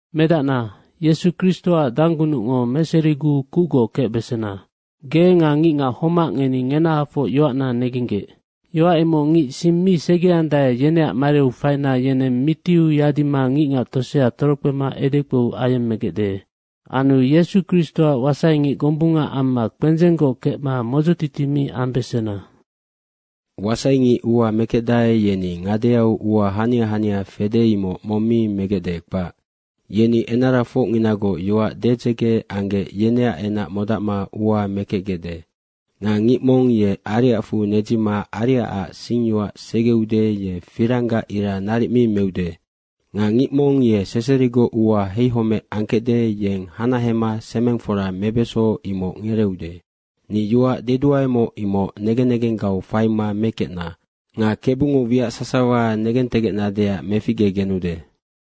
Medacna, Yesu Kristoac danggunucngo meseriguu kucgoc kecbesena. Ge nga ngicngac homac ngeni ngenahafoc yoacna negenggec. Yoac imoc ngic sing mi segeandae, yeneac mariu faina yeneng mitiu yadima ngicngac tosea torokpema edekpou ayemmegecde. Anu Yesu Kristoac wasaingic gombunga amma kpendzenggoc kecma modzotiti mi ambesena. Wasaingic ua mekecdae, yeni ngadeau ua hania hania fede, imoc mong mi megecde, kpac. Yeni enarafocnginagoc yoac dedzege anggec, yeneac enac modacma ua mekecgecde. Nga ngic mong ye ariacfu nedzima ariacac singyoac segeude, ye firanggac ira naric mi meude. Nga ngic mong ye seserigoc ua heihomec angkecde, yeng hanahema semengfora mebeso, imoc ngereeude. Ni yoac deduaemoc, imoc negen negenggau faima mekecna. Nga Kebungo wiac sasawa negentegecnadeac meficgegenude.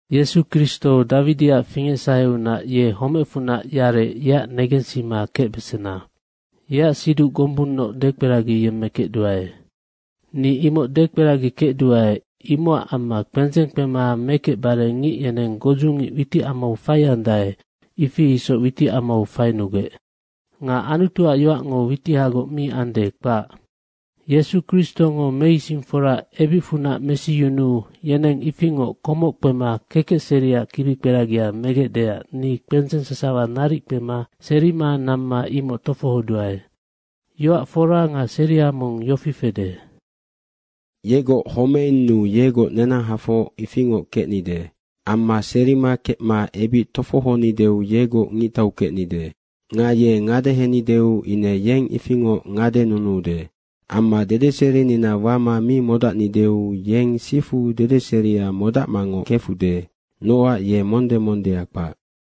Yesu Kristo, Dawidiac fingecsaheunac, ye homecfunac yarec, yeac negensima kecbesena. Yeac siduc gombunnoc dekperagiyemmekecduae. Ni imoc dekperagikecduae, imocac amma kpendzeng kpema mekecbare ngic yeneng godzungic witicamau faiandae, ifi isoc witicamau fainugec. Nga Anutuac yoacngo witihagoc mi ande, kpac. Yesu Kristongo meisingfora ebicfunac mesiyunuu yeneng ifingoc komoc kpema kekecseriac kibikperagia megecdeac ni kpendzeng sasawa naric kpema serima namma imoc tofohoduae. Yoac fora nga seria mong yofi fede: Yegoc homeinnu yegoc nenahafoc ifingoc kecnide. Amma serima kecma ebic tofohonideu yegoc ngictau kecnide. Nga ye ngadehenideu ine yeng ifingoc ngadenunuude. Amma dedeserinina wama mi modacnideu yeng sifu dedeseria modacmangoc kefude, nocac ye monde mondea kpac.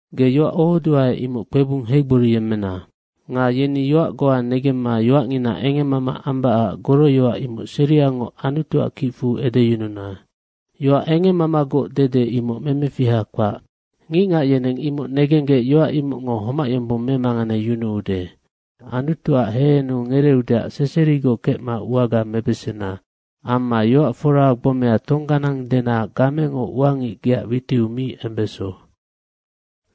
Ge yoac ohodua, imoc kpebung heigboriyemmena. Nga yeni yoac goa negemma yoacngina engemmama ambacac goroyoac imoc seriangoc Anutuac kicfu edeyununa. Yoac engemmamagoc dede, imoc memefiha kpac. Ngicngac yeneng imoc negenggec yoac imocngo homac yombong memanganeyunuude. Anutuac hehenu ngereeudeac seserigoc kecma uaga mebesena. Amma yoac fora gbomea tongganang dena gamengo ua ngic geac witiu mi embeso.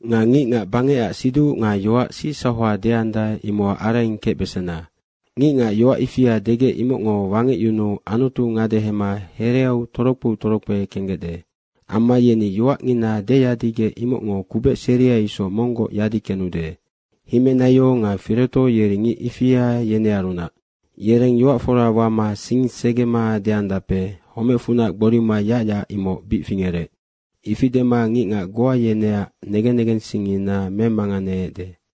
Nga ngicngac bangecac siduc nga yoac sicsauha deandae, imocac araing kecbesena. Ngicngac yoac ifia degec imocngo wangecyunuu Anutu ngadehema hereau torokpeu torokpe kenggecde. Amma yeni yoacngina deyadigec imocngo kubec seria isoc monggoc yadi kenude. Himenaio nga Fireto yeri ngic ifia yenearunac. Yereng yoac fora wama sing segema deandape, “Homecfunac gborima yacyac, imoc bic fingerec.” ifi dema ngicngac goa yeneac negen negensingngina memanganeecde.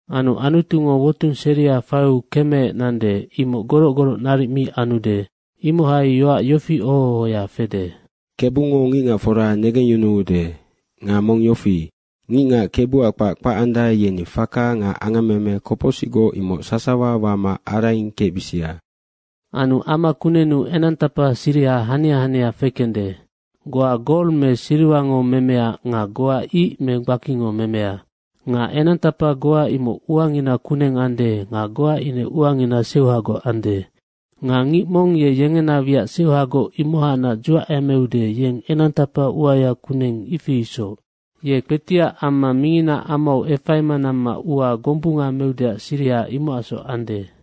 Anu Anutungo wotung seria faiu kemeec nande, imoc goroc goroc naric mi anude. Imohai yoac yofi oho ohoya fede, “Kebungo ngicngacfora negengyunuude.” Nga mong yofi, “Ngicngac Kebuac kpac kpacandae, yeni faka nga angammeme kopocsicgoc, imoc sasawa wama araing kecbisia.” Anu ama kunennu enangtapa siriha hania hania fekende. Goa gol me siriwango memea nga goa ic me gbakingo memea. Nga enangtapa goa imoc uangina kuneng ande nga goa ine uangina seuhagoc ande. Nga ngic mong ye yengena wiac seuhagoc imohacnac dzuacemeude, yeng enangtapa uaya kuneng, ifi isoc. Ye kpetiac amma minginaac amau efaima namma ua gombunga meudeac siriha imocacsoc ande.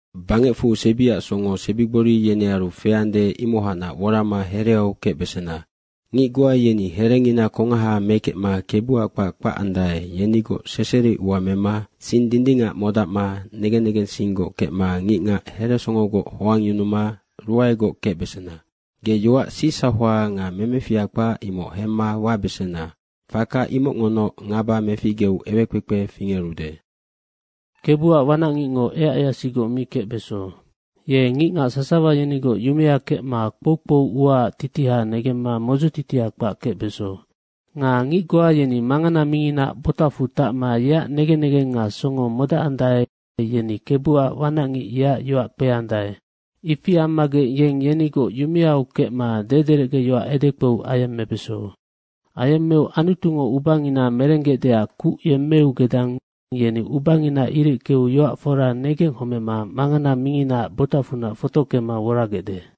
Bangecfu sebiac songo sebigbori yenearu feande, imohacnac worama hereau kecbesena. Ngic goa yeni herengina kongaha mekecma Kebuac kpac kpacandae, yenigoc seseri ua mema sing dindingac modacma negen negensinggoc kecma ngicngac heresongogoc hoangyunuma ruaegoc kecbesena. Ge yoac sicsauha nga memefiha kpac, imoc hemma wabesena. Faka imocngonoc ngaba meficgeu ewekpekpe fingerude. Kebuac wanacngicngo eaceasigoc mi kecbeso. Ye ngicngac sasawa yenigoc yumea kecma kpoukpou uaac titiha negemma modzotitia kpac kecbeso. Nga ngic goa yeni mangana minginaac botacfu tacma yeac negen negeng nga songo modacandae, yeni Kebuac wanacngic yeac yoac kpeandae, ifi ammagec yeng yenigoc yumeau kecma dederecgeyoac edekpou ayemmebeso. Ayemmeu Anutungo ubangina merenggecdeac kuc yemmeu gedang yeni ubangina ireckeu yoac fora negenghomema mangana minginaac botacfunac fotockema woragecde.